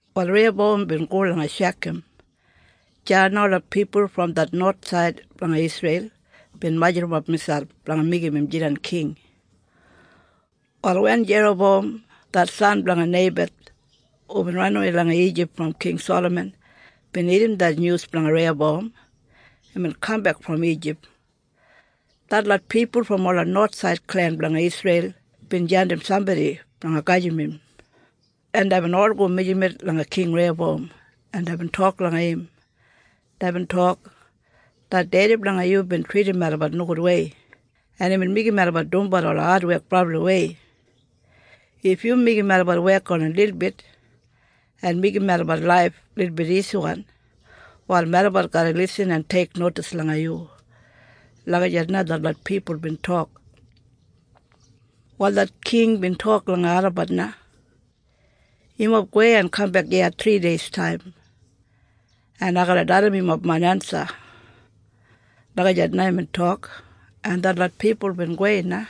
Wal Reiyabowam bin go langa Shekam. Deya na ola pipul brom det nowathsaid blanga Isreil bin majurrumap miselp blanga meigim im jidan king. Wal wen Jerabowam det san blanga Neibat hubin ranawei langa Ijip brom King Salaman bin irrim det nyus blanga Reiyabowam imbin kambek brom Ijip. Detlot pipul brom ola nowathsaid klen blanga Isreil bin jandim sambodi blanga gedim im, en deibin ol go mijamet langa King Reiyabowam en deibin tok langa im. Deibin tok, “Det dedi blanga yu bin tridim melabat nogudwei en imbin meigim melabat dumbat ola adwek brabliwei. If yu meigim melabat wek oni lilbit en meigim melabat laif lilbit isiwan, wal melabat garra lisin en teiknodis langa yu.” Lagijat na detlot pipul bin tok. Wal det king bin tok langa olabat na, “Yumob gowei en kambek iya thrideistaim en ai garra dalim yumob main ensa.” Lagijat na imbin tok. En detlot pipul bin gowei na.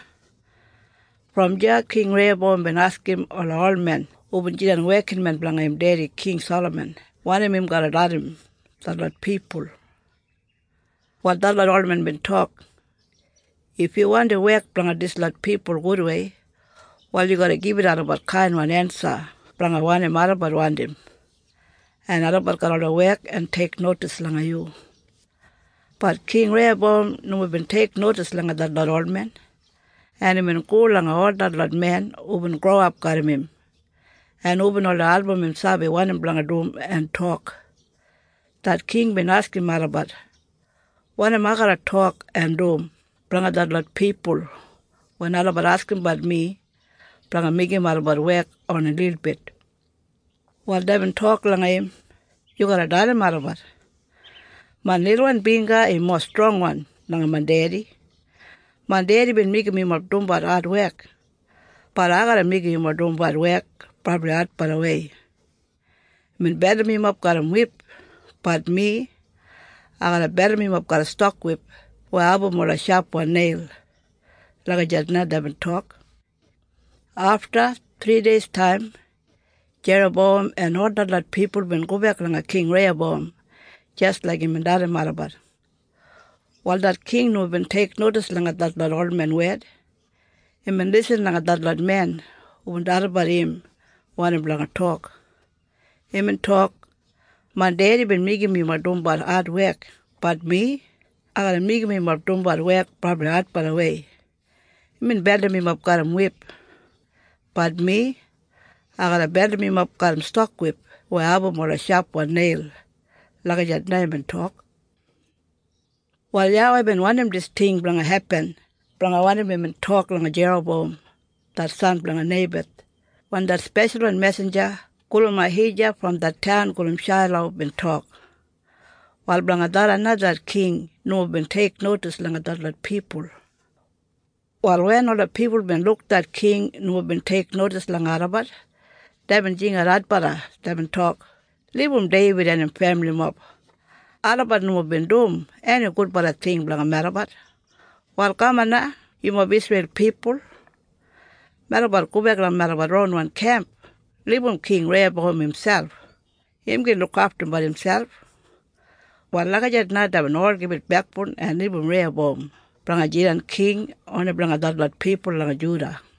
Brom deya King Reiyabowam bin askim ola olmen hubin jidan wekinmen blanga im dedi King Salaman wanim im garra dalim detlot pipul. Wal detlot olmen bin tok, “If yu wandi wek blanga dislot pipul gudwei, wal yu garra gibit olabat kainwan ensa blanga wanim olabat wandim, en olabat garra oldei wek en teiknodis langa yu.” Bat King Reiyabowam nomo bin teiknodis langa detlot olmen, en imbin go langa ol detlot men hubin growap garram im, en hubin oldei album im sabi wanim blanga dum en tok. Det king bin askim olabat, “Wanim ai garra tok en dum blanga detlot pipul wen olabat askimbat mi blanga meigim olabat wek oni lilbit?” Wal deibin tok langa im, “Yu garra dalim olabat, ‘Main lilwan bingga im mowa strongwan langa main dedi! Main dedi bin meigim yumob dumbat adwek, bat ai garra meigim yumob dumbat wek brabli adbalawei. Imbin beldim yumob garram wip, bat mi, ai garra beldim yumob garram stokwip weya abum ola shapwan neil.’” Lagijat na deibin tok. Afta thrideistaim, Jerabowam en ol detlot pipul bin gobek langa King Reiyabowam jis laik imbin dalim olabat. Wal det king nomo bin teiknodis langa detlot olmen wed. Imbin lisin langa detlot men hubin dalimbat im wanim blanga tok. Imbin tok, “Main dedi bin meigim yumob dumbat adwek, bat mi, ai garra meigim yumob dumbat wek brabli adbalawei. Imbin beldim yumob garram wip, bat mi, ai garra beldim yumob garram stokwip weya abum ola shapwan neil!” Lagijat na imbin tok. Wal YAWEI bin wandim dis ting blanga hepin blanga wanim imbin tok langa Jerabowam det san blanga Neibat wen det speshalwan mesinja gulum Ahija brom det taun gulum Shailo bin tok. Wal blanga tharran na det king nomo bin teiknodis langa detlot pipul. Wal wen ola pipul bin luk det king nomo bin teiknodis langa olabat, deibin jingat adbala. Deibin tok, “Libum Deibid en im femilimob. Olabat nomo bin dum eni gudbala ting blanga melabat. Wal kaman na yumob Isreil pipul. Melabat gobek langa melabat ronwan kemp. Libum King Reiyabowam miselp. Im gin lukaftumbat imselp.” Wal lagijat na deibin ol gibit bekboun en libum Reiyabowam blanga jidan king oni blanga detlot pipul langa Juda.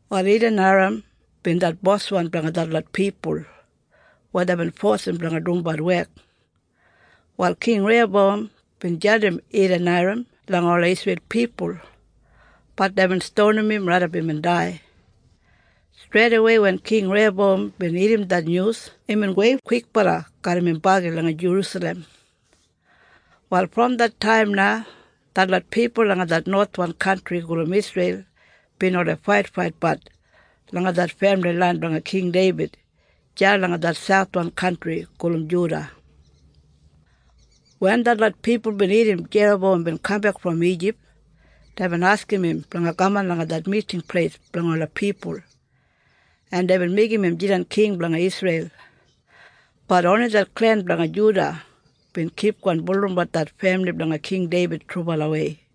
Wal Edaniram bin det boswan blanga detlot pipul weya deibin fosim blanga dumbat wek. Wal King Reiyabowam bin jandim Edaniram langa ola Isreil pipul, bat deibin stonim im raidap imbin dai. Streidawei wen King Reiyabowam bin irrim det nyus imbin gowei kwikbala garram im bagi langa Jerusalem. Wal brom det taim na detlot pipul langa det nowathwan kantri gulum Isreil, bin oldei faitfaitbat langa det femili lain blanga King Deibid deya langa det sauthwan kantri gulum Juda. Wen detlot pipul bin irrim Jerabowam bin kambek brom Ijip, deibin askim im blanga kaman langa det miting pleis blanga ola pipul, en deibin meigim im jidan king blanga Isreil. Bat oni det klen blanga Juda bin kipgon bulurrumbat det femili blanga King Deibid trubalawei.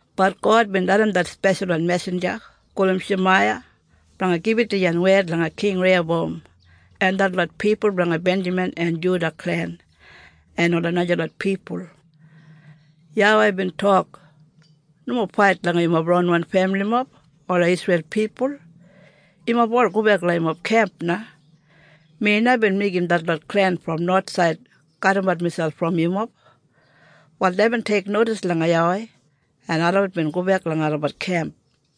Bat God bin dalim det speshalwan mesinja gulum Shemaiya blanga gibit dijan wed langa King Reiyabowam en detlot pipul blanga Benjamin en Juda klen en ola najalot pipul. YAWEI bin tok, “Nomo fait langa yumob ronwan femilimob, ola Isreil pipul. Yumob ol gobek langa yumob kemp na. Mi na bin meigim detlot klen brom nowathsaid kadimat miselp brom yumob.” Wal deibin teiknodis langa YAWEI en olabat bin gobek langa olabat kemp.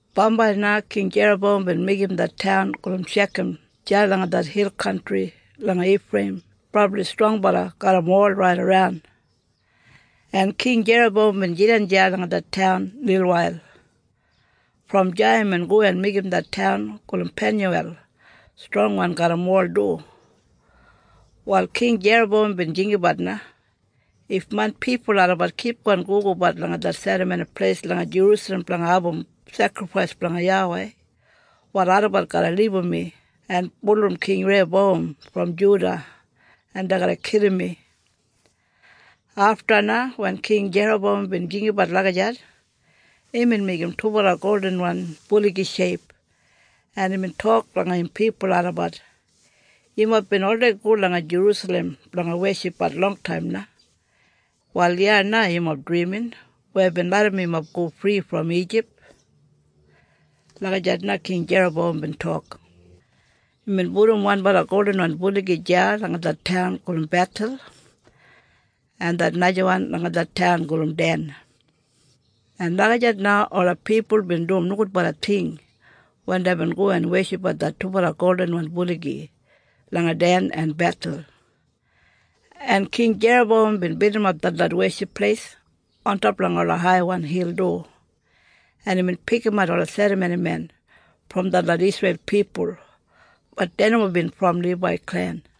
Bambai na King Jerabowam bin meigim det taun gulum Shekam deya langa det hil kantri langa Ifreiyim brabli strongbala garram wol raidaran, en King Jerabowam bin jidan deya langa det taun lilwail. Brom deya imbin go en meigim det taun gulum Penyuwel strongwan garram wol du. Wal King Jerabowam bin jinggabat na, “If main pipul olabat kipgon gogobat langa det Serramoni Pleis langa Jerusalem blanga abum sekrifais blanga YAWEI, wal olabat garra libum mi en bulurrum King Reiyabowam brom Juda en dei garra kilim mi.” Afta na, wen King Jerabowam bin jinggabat lagijat, imbin meigim dubala goldinwan buligi sheip en imbin tok langa im pipul olabat, “Yumob bin oldei go langa Jerusalem blanga weshipbat longtaim na. Wal iya na yumob drimin weya bin larram yumob go fri brom Ijip.” Lagijat na King Jerabowam bin tok. Imbin pudum wanbala goldinwan buligi deya langa det taun gulum Bethel, en det najawan langa det taun gulum Den. En lagijat na ola pipul bin dum nogudbala ting wen deibin go en weshipbat det dubala goldinwan buligi langa Den en Bethel. En King Jerabowam bin bildimap detlot weship pleis ontop langa ola haiwan hil du, en imbin pikimat ola serramonimen brom detlot Isreil pipul, bat dei nomo bin brom Libai klen.